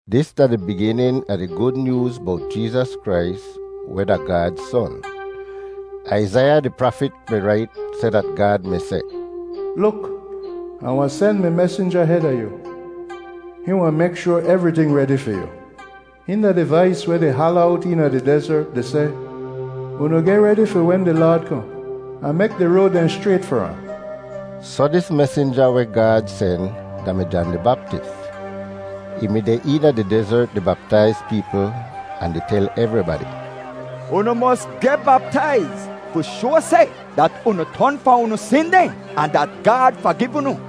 Dis da di biginin a di Gud Nyooz bowt Jeezas Krais weh da Gaad Son. Aizaiya di prafit mi rait seh dat Gaad mi seh, “Luk, Ah wahn sen mi mesinja heda yu. Hihn wahn mek shoar evriting redi fi yu.” “Hihn da di vais weh di hala owt eena di dezert di seh, ‘Unu geh redi fi wen di Laad kohn, ahn mek di road dehn schrayt far ahn.’” Soh dis mesinja weh Gaad sen da-mi Jan di Baptis. Ih mi deh eena di dezert di baptaiz peepl ahn di tel evribadi, “Unu mos geh baptaiz fi shoa seh dat unu ton fahn unu sin dehn ahn dat Gaad fagiv unu.”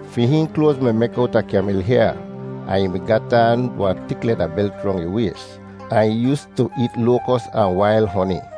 Fi hihn kloaz mi mek owta kyamil hyaa, ahn ih mi gat aan wahn tik leda belt rong ih ways, ahn ih yoostu eet loakos ahn wail honi.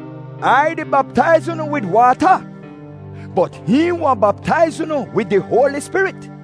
Ai di baptaiz unu wid waata, bot hihn wahn baptaiz unu wid di Hoali Spirit.”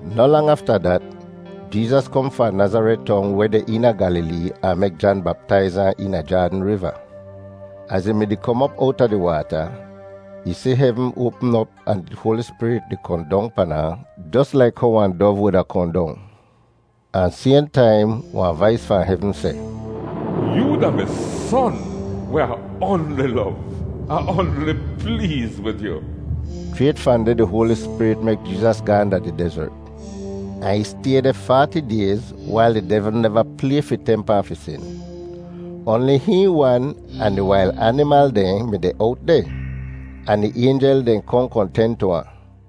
Noh lang afta dat, Jeezas kohn fahn Nazaret Tong weh deh eena Gyalilee ahn mek Jan baptaiz ahn eena Jaadn Riva. Az ih mi-di kom op owta di waata, ih si hevn oapm op ahn di Hoali Spirit di kohn dong pan ahn jos laik how wahn dov wuda kohn dong. Ahn sayhn taim, wahn vais fahn hevn seh, “Yoo da mi Son weh Ah oanli lov. Ah oanli pleez wid yu.” Schrayt fahn deh di Hoali Spirit mek Jeezas gaahn da di dezert, ahn ih stay deh faati dayz wail di devl neva play fi temp ahn fi sin. Oanli hihn wan ahn di wail animal dehn mi deh owt deh, ahn di aynjel dehn kohn kohn ten tu ahn.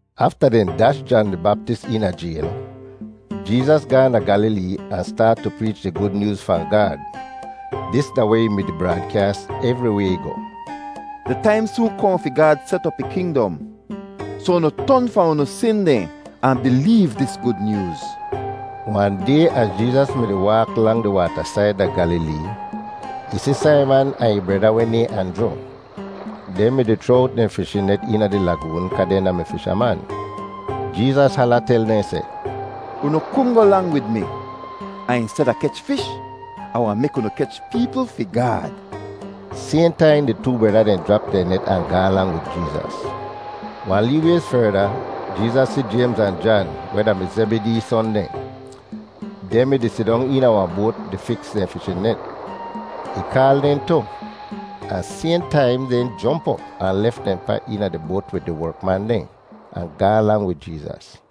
Afta dehn dash Jan di Baptis eena jayl, Jeezas gaahn da Gyalilee ahn staat tu preech di Gud Nyooz fahn Gaad. Dis da weh ih mi-di braadkyaas evriway ih goh: “Di taim soon kohn fi Gaad set op ih kingdom, soh unu ton fahn unu sin dehn ahn bileev dis Gud Nyooz.” Wahn day az Jeezas mi-di waak lang di waatasaid da Gyalilee, ih si Saiman ahn ih breda weh nayhn Anjru. Dehn mi-di chroa owt dehn fishin net eena di lagoon kaa dehn da-mi fishaman. Jeezas hala tel dehn seh, “Unu kungoh lang wid mi, ahn insteda kech fish, Ah wahn mek unu kech peepl fi Gaad!” Sayhn taim di too breda dehn jrap dehn net ahn gaahn lang wid Jeezas. Wahn lee wayz ferda, Jeezas si Jaymz ahn Jan, weh da-mi Zebidee son dehn. Dehn mi-di sidong eena wahn boat di fiks dehn fishin net. Ih kaal dehn tu, ahn sayhn taim dehn jomp op ahn lef dehn pa eena di boat wid di werkman dehn, ahn gaahn lang wid Jeezas.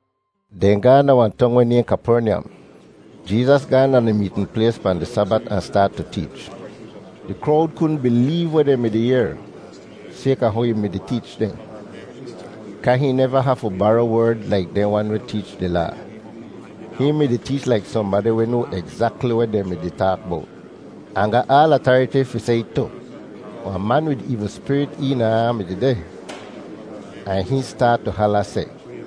Dehn gaahn da wahn tong weh nayhn Kapernyam. Jeezas gaahn da di meetn plays pahn di Sabat ahn staat tu teech. Di krowd kudn bileev weh dehn mi-di yehr, sayka how ih mi-di teech dehn; kaa hihn neva hafu bara werd laik dehn wan weh teech di Laa. Hihn mi-di teech laik sohnbadi weh noa egzakli weh dehn mi-di taak bowt, ahn ga aal atariti fi seh it tu. Wahn man wid eevl spirit eena ahn mi dehdeh, ahn hihn staat tu hala seh,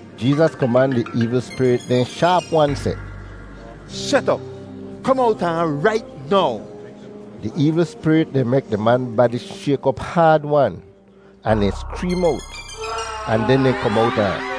Jeezas koman di eevl spirit dehn shaap-wan seh, “Shet op! Kom owta ahn rait now!” Di eevl spirit dehn mek di man badi shayk op haad-wan, ahn dehn skreem owt, ahn den dehn kom owta ahn.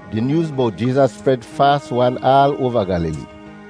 Di nyooz bowt Jeezas spred faas-wan aal oava Gyalilee.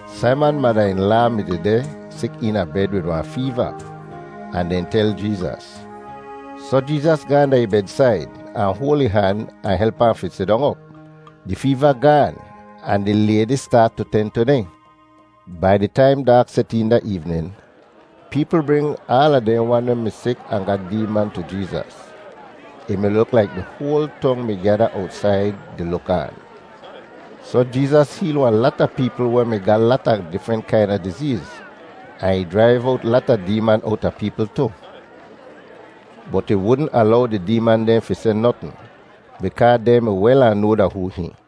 Saiman mada-in-laa mi dehdeh sik eena bed wid wahn feeva, ahn dehn tel Jeezas. Soh Jeezas gaahn da ih bedsaid, ahn hoal ih han ahn help ahn fi sidong op. Di feeva gaan ahn di laydi staat tu ten tu dehn! Bai di taim daak set een da eevnin, peepl bring aala dehn wan weh mi sik ahn ga deeman tu Jeezas. Ih mi luk laik di hoal tong mi gyada owtsaid di luk aan. Soh Jeezas heel wahn lata peepl weh mi ga lata difrent kaina dizeez, ahn ih jraiv owt lata deeman owta peepl tu. Bot ih wudn alow di deeman dehn fi seh notn bikaa dehn mi wel ahn noa da hoo hihn.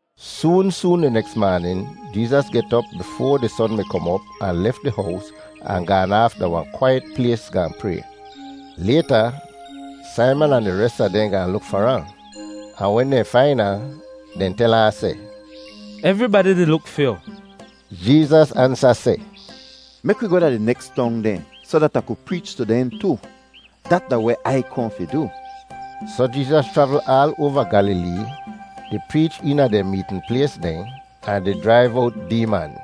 Soon soon di neks maanin Jeezas get op bifoa di son mi kom op ahn lef di hows ahn gaan aaf da wahn kwaiyet plays gaahn pray. Layta Saiman ahn di res a dehn gaahn luk far ahn, ahn wen dehn fain ahn, dehn tel ahn seh, “Evribadi di luk fi yu.” Jeezas ansa seh, “Mek wi goh da di neks tong dehn soh dat Ah ku preech tu dehn tu. Dat da weh Ai kohn fi du.” Soh Jeezas chravl aal oava Gyalilee di preech eena dehn meetn plays dehn ahn di jraiv owt deeman.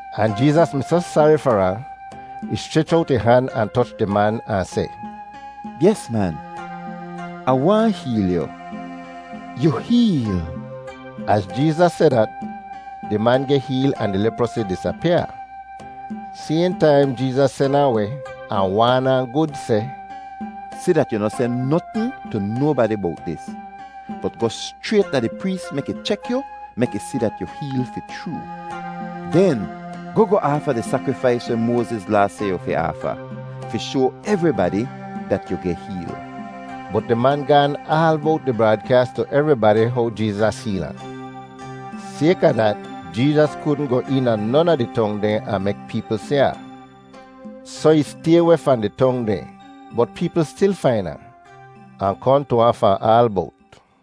Ahn Jeezas mi soh sari far ahn, ih schrech owt ih han ahn toch di man ahn seh, “Yes, man, Ah waahn heel yu. Yu heel!” Az Jeezas seh dat, di man geh heel ahn di leprosi disapyaa. Sayhn taim Jeezas sen ahn weh ahn waan ahn gud seh, “Si dat yu noh seh notn tu nobadi bowt dis; bot goh schrayt da di prees mek ih chek yu mek ih si dat yu heel fi chroo. Den goh goh aafa di sakrifais weh Moaziz Laa seh yu fi aafa, fi shoa evribadi dat yu geh heel.” Bot di man gaan aal bowt di braadkyaas tu evribadi how Jeezas heel ahn. Sayka dat, Jeezas kudn goh eena non a di tong dehn ahn mek peepl si ahn. Soh ih stay weh fahn di tong dehn, bot peepl stil fain ahn, ahn kohn tu ahn fahn aal bowt.